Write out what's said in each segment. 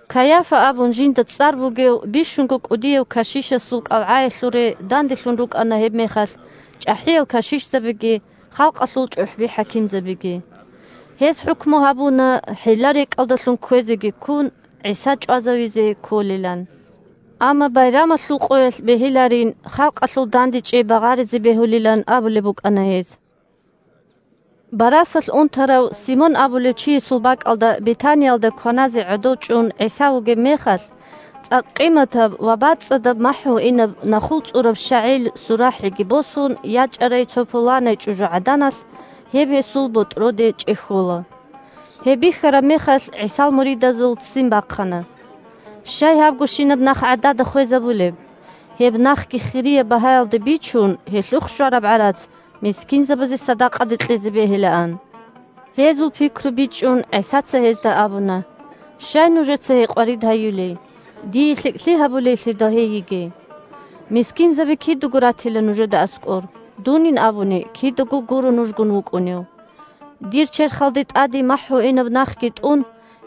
Кайафа абун жинда цӀар бугев бищунго кӀудияв кашишасул кӀалгӀаялъуре данделъун рукӀана гьебмехалъ чӀахӀиял кашишзабиги халкъалъул чӀухӀби-хӀакимзабиги. Гьез хӀукму гьабуна, хӀилла-рекӀкӀалдалъун кквезеги ккун, ГӀиса чӀвазавизе кколилан. Амма байрамалъул къоялъ бегьиларин, халкъалъул дандечӀей багъаризе бегьулилан абулеб букӀана гьез. Барасалъ унтарав Симон абулев чиясул бакӀалда Бетаниялда кваназе гӀодов чӀун ГӀиса вугеб мехалъ, цӀакъ къиматаб ва бацӀцӀадаб махӀгьуинаб нахул цӀураб щагӀил сурахӀиги босун ячӀарай цо пуланай чӀужугӀаданалъ, гьеб гьесул ботӀроде чӀехьола. Гьеб бихьараб мехалъ, ГӀисал муридазул ццин бахъана: – Щай гьабгощинаб нах гӀадада хвезабулеб? Гьеб нахги хирияб багьаялде бичун, гьелъухъ щвараб гӀарац мискинзабазе садакъаде кьезе бегьилаан. Гьезул пикру бичӀчӀун, ГӀисаца гьезда абуна: – Щай нужеца гьей къварид гьаюлей? Дие лъикӀлъи гьабулейлъидал гьей йигей. Мискинзаби кидаго ратила нужеда аскӀор. Дунин абуни, кидаго гуро нужгун вукӀунев. Дир черхалда тӀаде махӀгьуинаб нахги тӀун,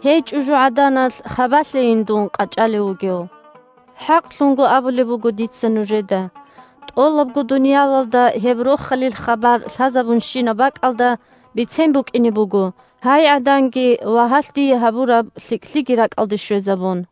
гьей чӀужугӀаданалъ хабалъейин дун къачӀалев вугев. ХӀакълъун абулеб буго дица нужеда: тӀолабго дуниялалда гьеб Рохалил хабар лъазабунщинаб бакӀалда бицен букӀине буго, гьай гӀаданги ва гьалъ дие гьабураб лъикӀлъиги ракӀалде щвезабун.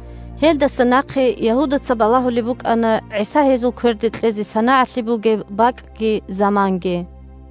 Гьелдаса нахъе Ягьудаца балагьулеб букӀана ГӀиса гьезул кверде кьезе санагӀалъи бугеб бакӀги заманги.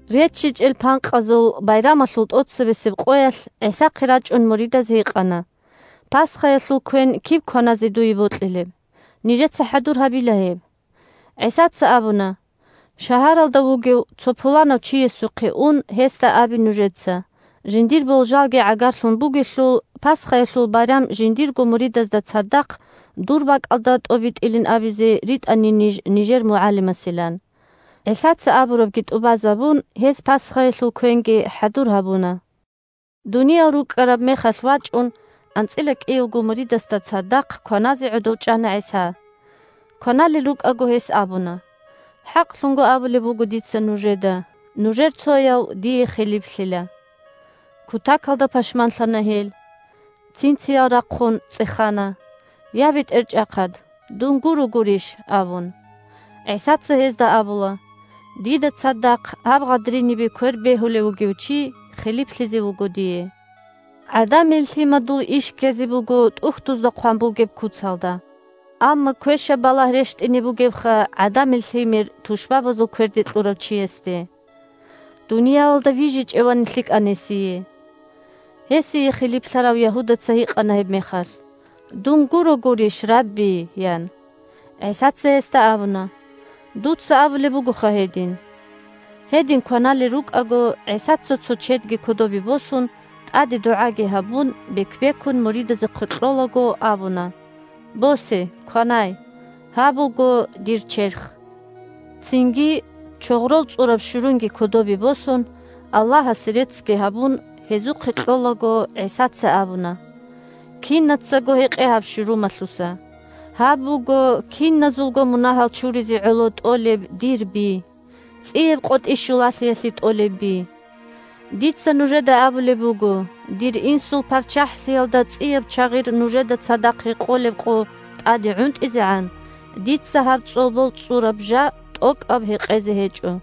РеччичӀел Панкъазул Байрамалъул тӀоцебесеб къоялъ, ГӀисахъе рачӀун, муридаз гьикъана: – Пасхаялъул квен киб кваназе дуе бокьилеб? Нижеца хӀадур гьабила гьеб. ГӀисаца абуна: – Шагьаралда вугев цо пуланав чиясухъе ун, гьесда абе нужеца, жиндир болжалги гӀагарлъун бугелъул, Пасхаялъул байрам жиндирго муридазда цадахъ дур бакӀалда тӀобитӀилин абизе ритӀанин ниж нижер МугӀалимасилан. ГӀисаца абурабги тӀубазабун, гьез пасхаялъул квенги хӀадур гьабуна. Дуниял рукӀкӀараб мехалъ вачӀун, анцӀила кӀиявго муридасда цадахъ кваназе гӀодов чӀана ГӀиса. Кваналел рукӀаго, гьес абуна: – ХӀакълъун абулеб буго дица нужеда: нужер цояв дие хилиплъила. Кутакалда пашманлъана гьел. Цин-циял рахъун цӀехана: – Я, БетӀерчӀахъад! Дун гуро гурищ? – абун. ГӀисаца гьезда абула: – Дида цадахъ гьаб гъадринибе квер бегьулев вугев чи хилиплъизе вуго дие. ГӀадамил Лъимадул иш ккезе буго ТӀухьдузда хъван бугеб куцалда. Амма квешаб балагь рещтӀине бугебха ГӀадамил Лъимер тушбабазул кверде кьурав чиясде. Дуниялалда вижичӀевани лъикӀан гьесие. Гьесие хилиплъарав Ягьудаца гьикъана гьебмехалъ: – Дун гуро гурищ, Рабби Дир МугӀалим.? – ян. ГӀисаца гьесда абуна: – Дуца абулеб бугоха гьедин. Гьедин кваналел рукӀаго, ГӀисаца, цо чедги кодобе босун, тӀаде дугӀаги гьабун, бек-бекун муридазухъе кьолаго, абуна: – Босе, кванай. Гьаб буго дир черх. Цинги, чогърол цӀураб щурунги кодобе босун, Аллагьасе реццги гьабун, гьезухъе кьолаго, ГӀисаца абуна: – Кинацаго гьекъе гьаб щурумалъуса. Гьаб буго киназулго мунагьал чуризе гӀоло тӀолеб дир би – ЦӀияб КъотӀи щулалъиялъе тӀолеб би. Дица нужеда абулеб буго: дир Инсул ПарччахӀлъиялда цӀияб чагъир нужеда цадахъ гьекъолеб къо тӀаде гӀунтӀизегӀан, дица гьаб цӀолбол цӀураб жа тӀокӀаб гьекъезе гьечӀо.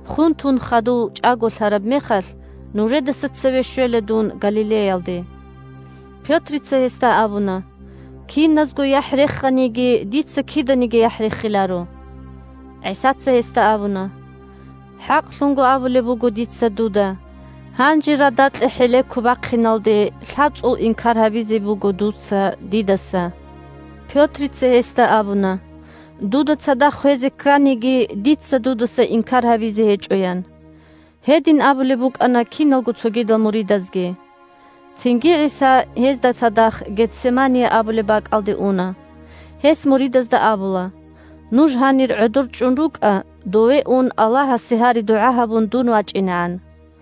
Хун тун хадув чӀаголъараб мехалъ нужедаса цеве щвела дун Галилеялде. Пётрица гьесда абуна: – Киназго яхӀ реханиги, дица киданиги яхӀ рехиларо. ГӀисаца гьесда абуна: – ХӀакълъун абулеб буго дица дуда: гьанже радакье хӀелеко бахъиналде лъабцӀул инкар гьабизе буго дуца дидаса. Пётрица гьесда абуна: – Дуда цадахъ хвезе кканиги, дица дудаса инкар гьабизе гьечӀо, – ян. Гьедин абулеб букӀана киналго цогидал муридазги. Цинги ГӀиса гьезда цадахъ Гетсемания абулеб бакӀалде уна. Гьес муридазда абула: – Нуж гьанир гӀодор чӀун рукӀа, дове ун, Аллагьасе гьари-дугӀа гьабун дун вачӀинегӀан.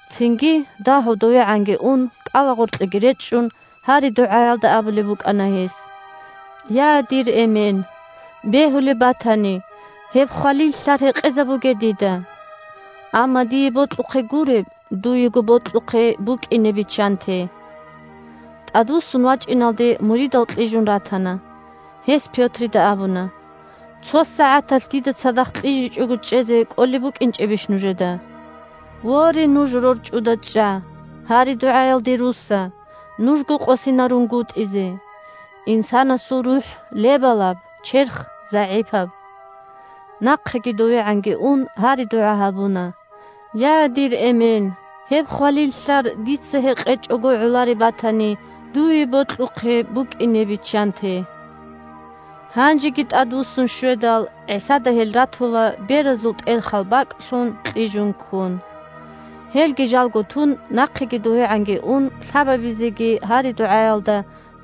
Цинги, дагьав довегӀанги ун, кӀалагъоркьеги речӀчӀун, гьари-дугӀаялда абулеб букӀана гьес: – Я, дир Эмен! Бегьулеб батани, гьеб хвалил лълъар гьекъезабуге дида. Амма дие бокьухъе гуреб, дуего бокьухъе букӀине биччанте. ТӀадвуссун вачӀиналде, муридал кьижун ратана. Гьес Пётрида абуна: – Цо сагӀаталъ дида цадахъ кьижичӀого чӀезе кӀолеб букӀинчӀебищ нужеда? Воре, нуж рорчӀуда чӀа! Гьари-дугӀаялде русса, нужго къосинарунгутӀизе. Инсанасул рухӀ – лебалаб, черх – загӀипаб. Нахъеги довегӀанги ун, гьари-дугӀа гьабуна: – Я, дир Эмен! Гьеб хвалил лълъар дица гьекъечӀого гӀолареб батани, дуе бокьухъе букӀине биччанте. Гьанжеги тӀадвуссун щведал, ГӀисада гьел ратула, беразул тӀелхал бакӀлъун, кьижун ккун. Гьелги жалго тун, нахъеги довегӀанги ун, лъабабизеги гьари-дугӀаялда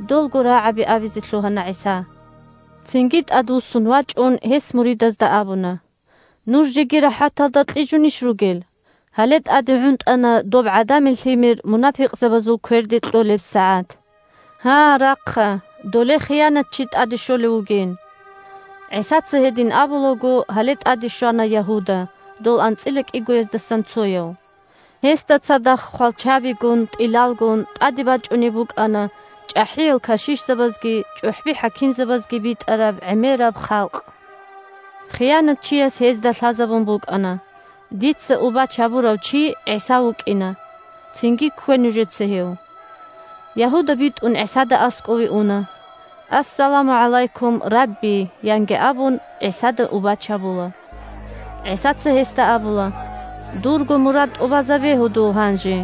долго рагӀаби абизе лъугьана ГӀиса. Цинги тӀадвуссун вачӀун, гьес муридазда абуна: – Нуж жеги рахӀаталда кьижунищ ругел? Гьале тӀаде гӀунтӀана доб ГӀадамил Лъимер мунапикъзабазул кверде кьолеб сагӀат. Гьа, рахъа, доле хиянатчи тӀаде щолев вугин. ГӀисаца гьедин абулаго, гьале тӀаде щвана Ягьуда – дол анцӀила кӀигояздасан цояв. Гьесда цадахъ хвалчабигун, тӀилалгун тӀаде бачӀунеб букӀана чӀахӀиял кашишзабазги чӀухӀби-хӀакимзабазги битӀараб гӀемераб халкъ. Хиянатчияс гьезда лъазабун букӀана: «Дица убач гьабурав чи ГӀиса вукӀина. Цинги ккве нужеца гьев». Ягьуда битӀун ГӀисада аскӀове уна. – Ассаламу гӀалайкум, Рабби! – янги абун, ГӀисада убач гьабула. ГӀисаца гьесда абула: – Дурго мурад тӀубазабе, гьудул, гьанже.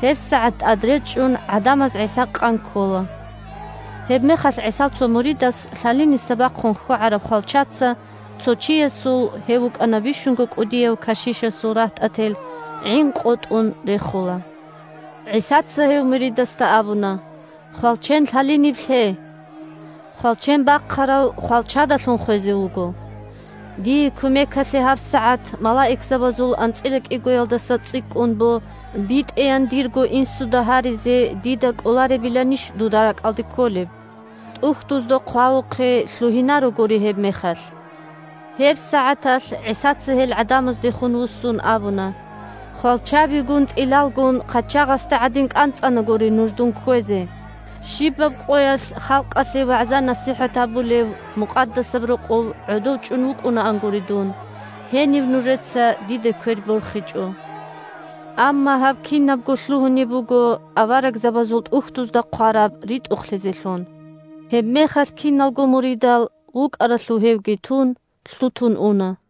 ГьебсагӀат тӀадречӀчӀун гӀадамаз ГӀиса къан ккола. Гьебмехалъ ГӀисал цо муридас лъалиниса бахъун хьвагӀараб хвалчаца цо чиясул (гьев вукӀана бищунго кӀудияв кашишасул рагьтӀател) гӀин къотӀун рехула. ГӀисаца гьев муридасда абуна: – Хвалчен лъалиниб лъе! Хвалчен бахъарав хвалчадалъун хвезе вуго. Дие кумекалъе гьабсагӀат малаикзабазул анцӀила кӀигоялдаса цӀикӀкӀун бо битӀеян дирго Инсуда гьаризе дида кӀоларебиланищ дуда ракӀалде кколеб? ТӀухьдузда хъвавухъе лъугьинарогури гьебмехалъ. ГьебсагӀаталъ ГӀисаца гьел гӀадамаздехун вуссун абуна: – Хвалчабигун, тӀилалгун хъачагъасде гӀадин кӀанцӀанагури нуж дун кквезе. Щибаб къоялъ халкъалъе вагӀза-насихӀат гьабулев Мукъадасаб Рокъов гӀодов чӀун вукӀунаангури дун, гьениб нужеца диде квер борхичӀо. Амма гьаб кинабго лъугьунеб буго аварагзабазул ТӀухьдузда хъвараб ритӀухълъизелъун. Гьебмехалъ киналго муридал, вукӀаралъув гьевги тун, лъутун уна.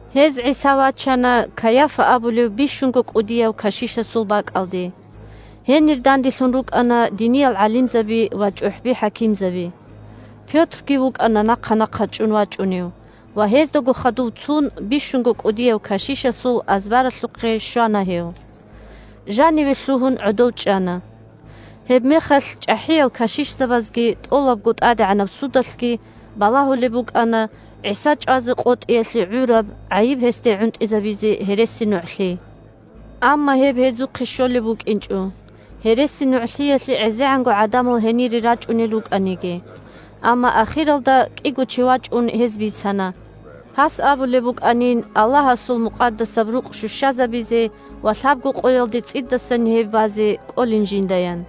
Гьез ГӀиса вачана Кайафа абулев бищунго кӀудияв кашишасул бакӀалде. Гьенир данделъун рукӀана диниял гӀалимзаби ва чӀухӀби-хӀакимзаби. Пётрги вукӀана нахъа-нахъа чӀун вачӀунев, ва гьездаго хадув цун, бищунго кӀудияв кашишасул азбаралъухъе щвана гьев. Жаниве лъугьун, гӀодов чӀана. Гьебмехалъ чӀахӀиял кашишзабазги тӀолабго тӀадегӀанаб судалъги балагьулеб букӀана ГӀиса чӀвазе къотӀиялъе гӀураб гӀайиб гьесде гӀунтӀизабизе гьересинугӀлъи. Амма гьеб гьезухъе щолеб букӀинчӀо, гьересинугӀлъиялъе гӀезегӀанго гӀадамал гьенире рачӀунел рукӀаниги. Амма ахиралда кӀиго чи вачӀун, гьез бицана, гьас абулеб букӀанин Аллагьасул Мукъадасаб Рукъ щущазабизе ва лъабго къоялде цӀидасан гьеб базе кӀолин жиндаян.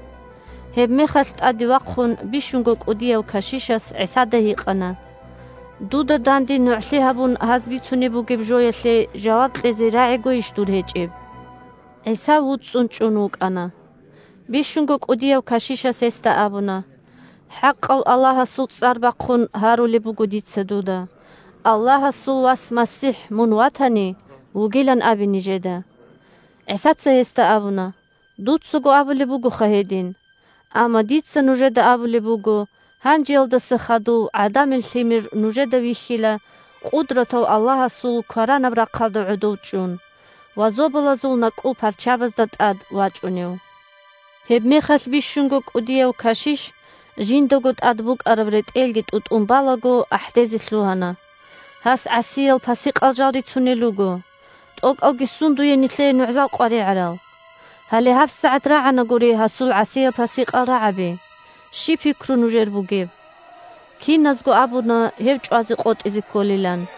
Гьебмехалъ, тӀаде вахъун, бищунго кӀудияв кашишас ГӀисада гьикъана: – Дуда данде нугӀлъи гьабун гьаз бицунеб бугеб жоялъе жаваб кьезе рагӀигойищ дур гьечӀеб? ГӀиса вуцӀцӀун чӀун вукӀана. Бищунго кӀудияв кашишас гьесда абуна: – ХӀакъав Аллагьасул цӀар бахъун гьарулеб буго дица дуда: Аллагьасул Вас МасихӀ мун ватани, вугилан абе нижеда. ГӀисаца гьесда абуна: – Дуцаго абулеб бугоха гьедин, амма дица нужеда абулеб буго: гьанжеялдаса хадув ГӀадамил Лъимер нужеда вихьила Къудратав Аллагьасул кваранаб рахъалда гӀодов чӀун ва зобалазул накӀкӀул парчабазда тӀад вачӀунев. Гьебмехалъ бищунго кӀудияв кашиш, жиндаго тӀад букӀараб ретӀелги тӀутӀун балаго, ахӀдезе лъугьана: – Гьас гӀасиял-пасикъал жал рицунел руго. ТӀокӀалги сундуе нилъее нугӀзал къваригӀарал? Гьале гьабсагӀат рагӀанагури гьасул гӀасиял-пасикъал рагӀаби. Щиб пикру нужер бугеб? Киназго абуна гьев чӀвазе къотӀизе кколилан.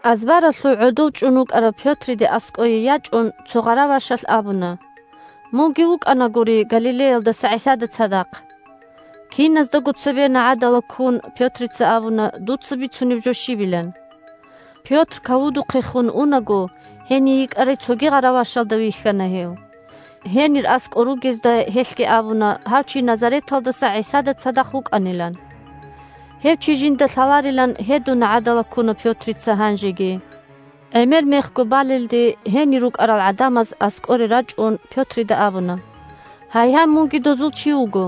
Азбаралъув гӀодов чӀун вукӀарав Пётрида аскӀое ячӀун, цо гъаравашалъ абуна: – Мунги вукӀанагури Галилеялдаса ГӀисада цадахъ. Киназдаго цебе нагӀадала ккун, Пётрица абуна дуца бицунеб жо щибилан. Пётр кавудухъехун унаго, гьений йикӀарай цоги гъаравашалда вихьана гьев. Гьенир аскӀор ругезда гьелъги абуна гьав чи Назареталдаса ГӀисада цадахъ вукӀанилан. Гьев чи жинда лъаларилан гьедун нагӀадала ккуна Пётрица гьанжеги. ГӀемер мехго балелде гьенир рукӀарал гӀадамаз, аскӀоре рачӀун, Пётрида абуна: «Гьайгьай, мунги дозул чи вуго.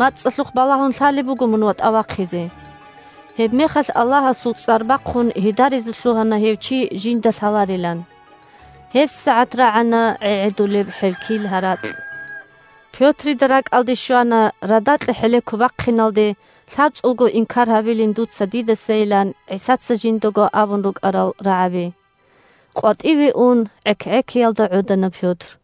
МацӀалъухъ балагьун лъалеб буго мун ватӀа вахъизе». Гьебмехалъ Аллагьасул цӀар бахъун гьедаризе лъугьана гьев чи жинда лъаларилан. ГьебсагӀат рагӀана гӀегӀедулеб хӀелкил гьаракь. Пётрида ракӀалде щвана радакье хӀелеко бахъиналде, лъабцӀулго инкар гьабилин дуца дидасайилан ГӀисаца жиндаго абун рукӀарал рагӀаби. КъватӀиве ун гӀек-гӀекиялда гӀодана Пётр.